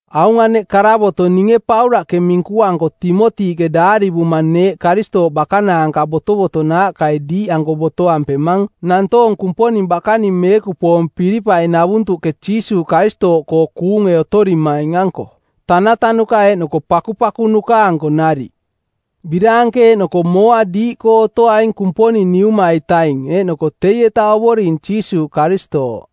Aung aneꞌ karavoto˜ ninge Paulaꞌke minkuanko Timotiꞌke daarivuma neeꞌ Karistooꞌ bakanaanka botovotonaaꞌkai diiꞌanko botoampemang nantoong Kumponing bakaning meekupoong Pilipai-navuntuꞌke Jiisuuꞌ Karistooꞌkoo kuunge otorimaing-anko, tanatanuka eeꞌnoko pakupakunuka-anko nariꞌ. Biraanke eeꞌnoko mooa diiꞌkoo otoaing Kumponing Niuma-itaing eeꞌnoko teieta Ovoring Jiisuuꞌ Karistooꞌ.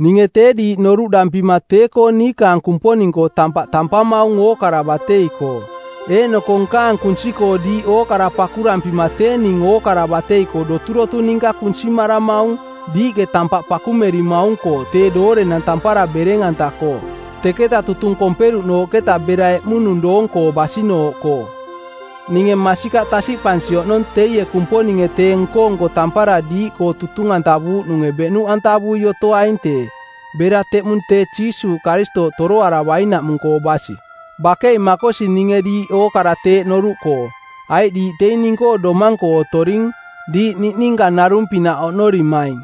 Ninge tee diiꞌ noruꞌdampima tee-koo nkaang Kumponing-koo tampaꞌ tampamaung ookara batei-koo. Eeꞌnoko nkaang kunsi-koo diiꞌ ookara pakurampima tee ning ookara batei-koo doturotu ninka kunsimaramaung, diiꞌke tampaꞌ pakumerimaung-koo tee doorenang tampara bereng-anta-koo, teketa tutung komperuꞌnooꞌketa bera eꞌmunung doong-koo basinooꞌkoo. Ninge masikaꞌ tasiꞌpansi oꞌnong teie Kumponinge tee nko-nko tampara diiꞌkoo tutung-antavuuꞌnunge beꞌnuꞌantavui otoaing tee, bera teꞌmung tee Jiisuuꞌ Karistooꞌ toroaravainaꞌmung-koo basi. Bakei makosi ninge diiꞌ ookara teeꞌ noruꞌkoo, aiꞌ diiꞌ teing ning-koo domang-koo otoring, diiꞌ niꞌninka narung-pinaꞌ oꞌnorimaing.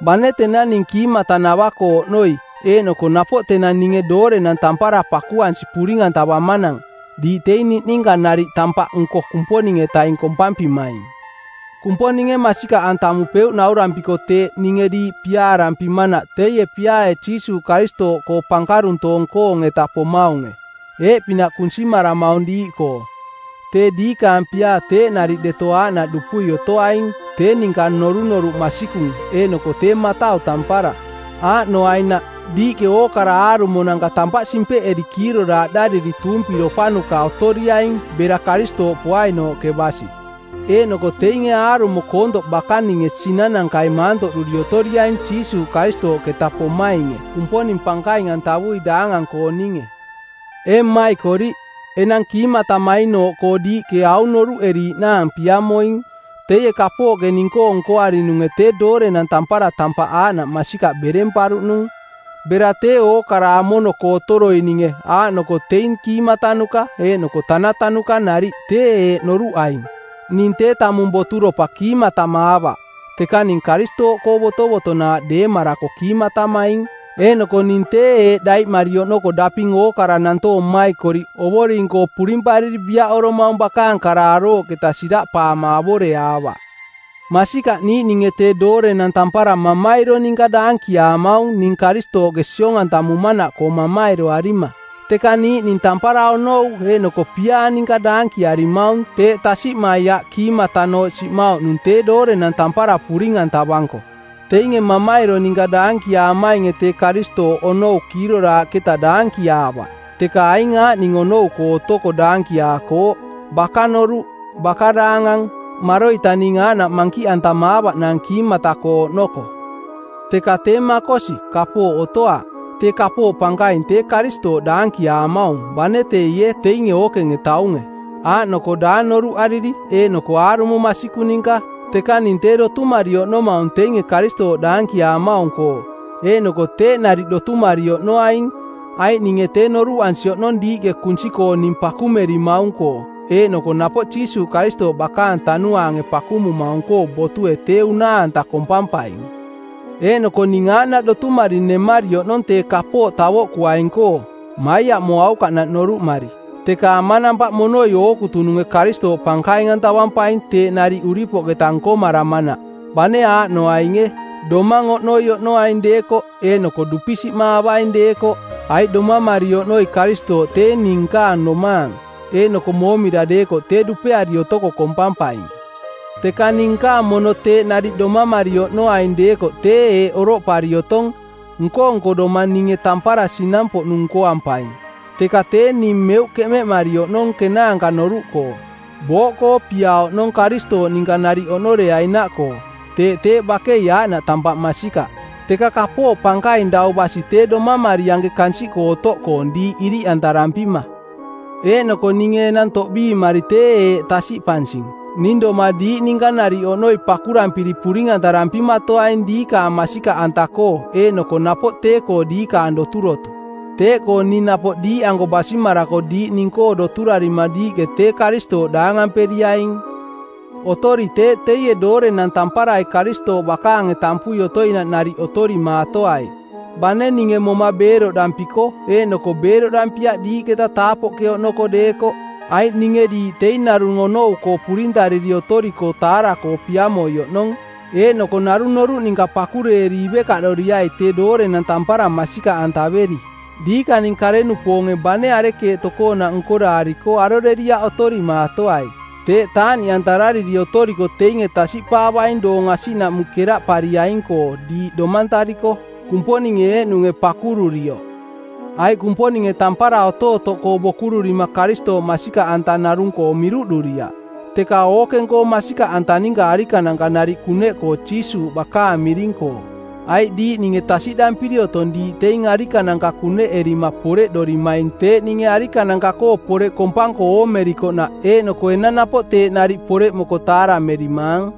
Bane tenang ning kiimatanava-koo oꞌnoi eeꞌnoko napoꞌ tenang ninge doorenang tampara pakuansi puring-antavamanang, diiꞌ teing niꞌninka nariꞌ tampaꞌnko Kumponing-etaing kompampimaing. Kumponinge masikaꞌantamupeuꞌ naurampiko teeꞌ ninge diiꞌ piaarampimanaꞌ teie piaae Jiisuuꞌ Karistooꞌkoo pankaruntoong-koong-eta pomaunge. Eeꞌ pinaꞌ kunsimaramaung diiꞌkoo: tee diikaang piaa teeꞌ nariꞌ deto aaꞌnaꞌ dupui otoaing, tee ninka norunoruꞌ masikung eeꞌnoko tee matau tampara. Aaꞌnoainaꞌ, diiꞌke ookara aarumonanka tampaꞌ simpeꞌeri kiiroraaꞌdariri tuumpiropanuka otoriaing bera Karistooꞌ poainooꞌke basi. Eeꞌnoko teinge aarumo koontoꞌ bakaninge sinanankai maantoꞌduri otoriaing Jiisuuꞌ Karistooꞌketa pomainge Kumponing pankaing-antavui daangang-kooninge. Ee mmaikoriꞌ, enang kiimatamainooꞌkoo diiꞌke aung noruꞌeriiꞌnaang piamoing, teie kapooꞌke ning-koo nkoarinunge tee doorenang tampara tampaꞌ aaꞌnaꞌ masikaꞌ beremparuꞌnung. Bera tee ookarai amono-koo otoroininge aaꞌnoko teing kiimatanuka eeꞌnoko tanatanuka nariꞌ tee eeꞌ noruꞌaing: Ning tee tamung boturopa kiimatamaavaꞌ, teka ning Karistooꞌkoo botovotonaaꞌ deemarako kiimatamaing. Eeꞌnoko ning tee eeꞌ daiꞌmari oꞌnoko daping ookara nantoong mmaikoriꞌ Ovoring-koo purimpariri biaꞌoromaung bakaang kara arooꞌketa siraꞌpaama avoreaavaꞌ. Masikaꞌ niiꞌninge tee doorenang tampara mamairo ninka daankiaamaung ning Karistooꞌke siong-antamumanaꞌkoo mamairoarima. Teka niiꞌning tampara onou eeꞌnoko piaa ninka daankiarimaung teeꞌ tasiꞌmai aꞌ kiimatanooꞌ siꞌmauꞌnung tee doorenang tampara puring-antavanko. Teinge mamairo ninka daankiaamainge tee Karistooꞌ onou kiiroraaꞌketa daankiaavaꞌ, teka aing aaꞌning onou-koo otoko daankiaakooꞌ: baka-noruꞌ, baka daangang, maroita ning aaꞌnaꞌ mankiꞌantamaavaꞌnaang kiimata-koo oꞌnoko. Teka tee makosi, kapooꞌ otoaꞌ. Tee kapooꞌ pankaing tee Karistooꞌ daankiaamaung bane teie teinge ookenge taunge, aaꞌnoko daang noruꞌariri eeꞌnoko aarumo masikung ninka. Teka ning tee dotumari oꞌnomaung teinge Karistooꞌ daankiaamaung-koo. Eeꞌnoko teeꞌ nariꞌ dotumari oꞌnoaing, aiꞌ ninge tee noruꞌansi oꞌnong diiꞌke kunsi-koo ning pakumerimaung-koo eeꞌnoko napoꞌ Jiisuuꞌ Karistooꞌ bakaang tanuaange pakumumaung-koo botue tee unaa-anta kompampaing. Eeꞌnoko ning aaꞌnaꞌ dotumari nemari oꞌnong tee kapooꞌ tavoꞌkuaing-koo, maiaꞌmoaukaꞌnaꞌ noruꞌmari, teka amanampaꞌ monoi ookutununge Karistooꞌ pankaing-antavampaing teeꞌ nariꞌ uripoꞌketa nkomaramanaꞌ, bane aaꞌnoainge: domang oꞌnoi oꞌnoaing deekoꞌ, eeꞌnoko dupisiꞌmaavaing deekoꞌ. Aiꞌ domamari oꞌnoi Karistooꞌ tee ning nkaang domaang, eeꞌnoko moomira deekoꞌ tee dupeari otoko kompampaing. Teka ning nkaang mono teeꞌ nariꞌ domamari oꞌnoaing deekoꞌ tee eeꞌ oroꞌpari otong, nko-nko doma ninge tampara sinang-poꞌnung nkoampaing, teka tee ning meuꞌ keꞌmeꞌmari oꞌnong kenaanka noruꞌkoo. Booꞌkoo pia oꞌnong Karistooꞌ ninka nariꞌ oꞌnoreainaꞌkoo, teeꞌ teeꞌ bakei aaꞌnaꞌ tampaꞌ masikaꞌ. Teka kapooꞌ pankaing dau basi tee domamari anke kansiꞌkoo otoꞌkoong diiꞌ iriꞌantarampima. Eeꞌnoko ninge enang toꞌbiimari tee eeꞌ tasiꞌpansing: ning doma diiꞌ ninka nariꞌ oꞌnoi pakurampiri puring-antarampimatoaing diikaang masikaꞌanta-koo eeꞌnoko napoꞌ tee-koo diikaang doturotu. Teeꞌkoo ning napoꞌ diiꞌanko basimarako diiꞌ ning-koo doturarima diiꞌke tee Karistooꞌ daangamperiaing. Otori teeꞌ teie doorenang tamparai Karistooꞌ bakaange tampui otoinaꞌ nariꞌ otorimaatoai, bane ninge moma beeroꞌdampiko eeꞌnoko beeroꞌdampiaꞌ diiꞌketa taapoꞌke oꞌnoko deekoꞌ, aiꞌ ninge diiꞌ teing narung onou-koo purintariri otoriko taara-koo piamoi oꞌnong, eeꞌnoko narung noruꞌ ninka pakureeri ivekaꞌdoriai tee doorenang tampara masikaꞌantaveri. Diikaning kare-nupoonge bane arekeeꞌ tokoonaꞌ nkoraariko aroreriaꞌ otorimaatoai. Teeꞌ taaꞌniꞌantarariri otoriko teinge tasiꞌpaavaing doong asiꞌnaꞌmung keraꞌpariaing-koo diiꞌ domantariko, Kumponinge eeꞌnunge pakururioꞌ. Aiꞌ Kumponinge tampara otootoꞌkoo bokururima Karistooꞌ masikaꞌanta narung-koo miruꞌduriaꞌ, teka ookeng-koo masikaꞌanta ninka arikananka nariꞌ kuneꞌkoo Jiisuuꞌ bakaang miring-koo. Aiꞌ diiꞌ ninge tasiꞌdampiri otong diiꞌ teing arikananka kuneꞌerima poreꞌdorimaing teeꞌ ninge arikananka-koo poreꞌ kompanko oomerikoꞌnaꞌ eeꞌnoko enang napoꞌ teeꞌ nariꞌ poreꞌmoko taaramerimaang.